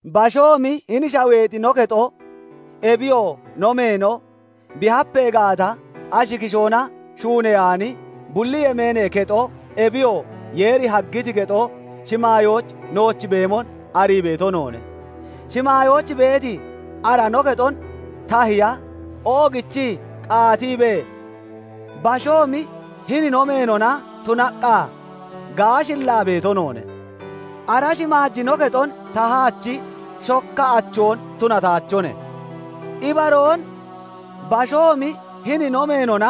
Bashoomi hini shaweexi no kexo, ebiyoo no meeno, bi hapee gaata, ashi kishoona shuuneyaani, bulli yemeenee kexo, ebiyoo Yeeri haggiti kexo, shimaayooch nooch beemon arii beeto noone. Shimaayooch beeti ara no kexon tahiya oogichii qaatiibee, bashoomi hini no meenona tunaqqa gaashillaa beeto noone; ara shimaaji no kexon tahaachi shokka achoon tunataachone. Ibaroon bashoomi hini no meenona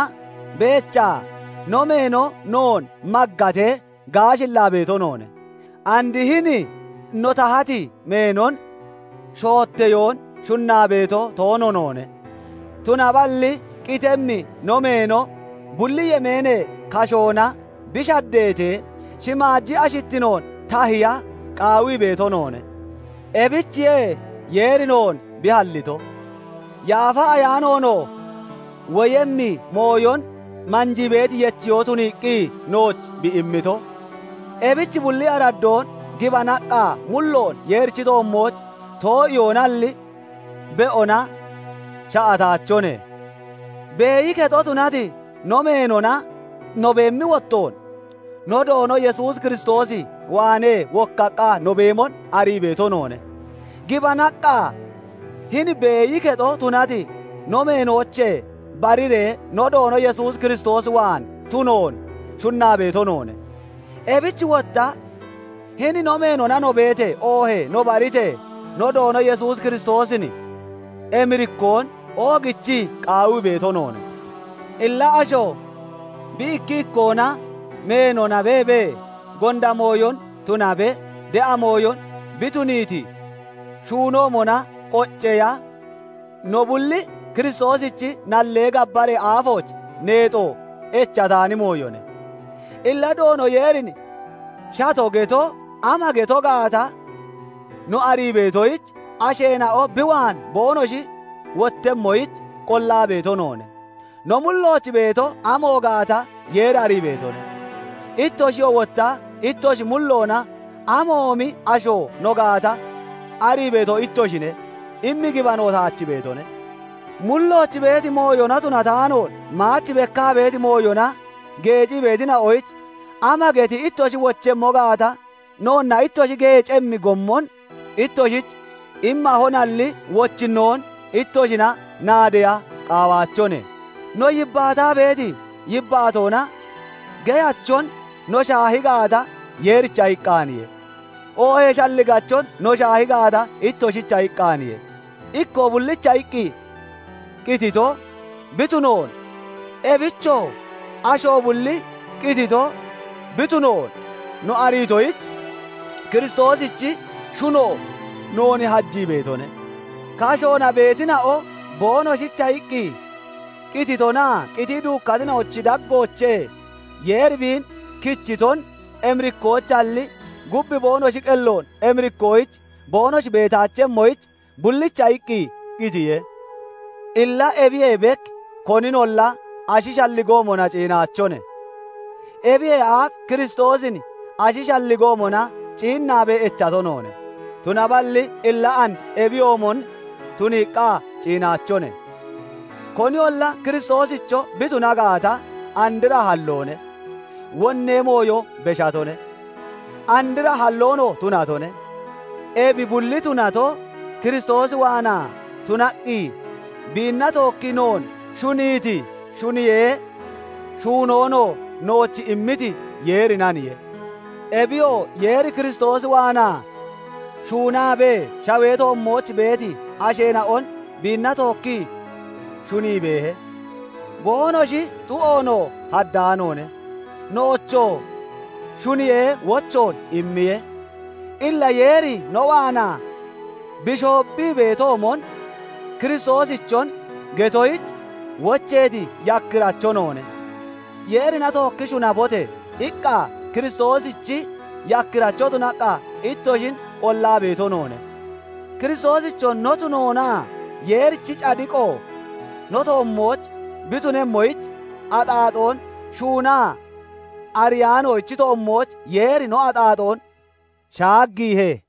beechaa, no meeno noon maggatee gaashillaa beeto noone; and hini no tahati meenon shootteyoon shunnaa beeto toono noone; tunaballi qitemmi no meeno bulli yemeenee kashoona bi shaddeetee shimaaji ashittinoon tahiya qaawii beeto noone. Ebichiye Yeeri noon bi hallito; Yaafa Ayaanoonoo woyemmi mooyon manjii beeti yechiyoo tuniiqqi nooch bi immito. Ebich bulli araddoon gibanaqqa mulloon Yeerichi toommooch too'iyoonalli, be'ona sha'ataachone; beeyi kexo tunati no meenona no beemmi wottoon, no Doono Yesuus Kiristoos waanee wokkaqqa no beemon arii beeto noone. Gibanaqqa, hini beeyi kexo tunati no meenoochee bariree no Doono Yesuus Kiristoos waan tunoon shunnaa beeto noone. Ebich wotta hini no meenona no beetee, oohee no baritee, no Doono Yesuus Kiristoosin emirikkoon oogichii qaawii beeto noone. Illa asho bi ikki ikkoona meenona beebee, gonda mooyon tunabe de'a mooyon bi tuniiti shuunoomona qocceeya, no bulli Kiristoosichi nallee gabbaree aafooch neexo echataani mooyone. Illa Doono Yeerin shato geto ama geto gaata no arii beetoyich, asheena'o bi waan boonoshi wottemmoyich qollaa beeto noone; no mullooch beeto amo gaata Yeeri arii beetone; ittoshiyoo wotta ittoshi mulloona amoomi asho no gaata arii beeto ittoshine immi gibano taach beetone. Mullooch beeti mooyona tunataanoon maach bekkaa beeti mooyona geecii beetina'oyich ama geti ittoshi wochemmo gaata, noonna ittoshi geecemmi gommon ittoshich immahonalli, wochinnoon ittoshina naadeya qaawaachone. No yibbaataa beeti yibbaatoona geyachon no shaahi gaata, Yeericha iqqaaniye; oohee shalligachon no shaahi gaata, ittoshicha iqqaaniye. Ikkoo bullicha iqqi qitito bi tunoon, ebichoo asho bulli qitito bi tunoon no ariitoyich, Kiristoosichi shuno noon hajii beetone. Kashoona beetina'o boonoshicha iqqi qititonaa qitii duukkatina'ochi daggoochee Yeeri biin kichitonon emirikkoyichalli, gub boonoshi qelloon emirikkoyich boonoshi beetaachemmoyich bullicha iqqi qitiye. Illa ebiyee bek koninolla ashi shalligoomona ciinaachone; ebiyee aaf Kiristoosin ashi shalligoomona ciinnaabee echato noone; tunaballi illa and ebiyoomon tuniiqqa ciinaachone. Koniyolla Kiristoosicho bi tuna gaata, andra halloone; wonnee mooyo beshatone; andra halloonoo tunatone! Ebi bulli tunato, Kiristoos waanaa tunaqqi biinna tookkii noon shuniiti, shuniyee shuunoonoo nooch immiti Yeerinaniye; ebiyoo Yeeri Kiristoos waanaa shuunaabee shawee toommooch beeti asheena'on biinna tookkii shunii beehe; boonoshi xu'oonoo haddaanoone; noochoo shuniyee wochoon immiye. Illa Yeeri no waanaa bi shoobbii beetoomon, Kiristoosichon getoyich wocheeti yakkiracho noone; Yeerina tookki shunabote! iqqa Kiristoosichi yakkiracho tunaqqa ittoshin qollaa beeto noone. Kiristoosicho no tunoona Yeerichi cadiqo no toommooch bi tunemmoyich, axaaxoon shuunaa ariyaanoochi toommooch Yeeri no axaaxoon shaaggiihe.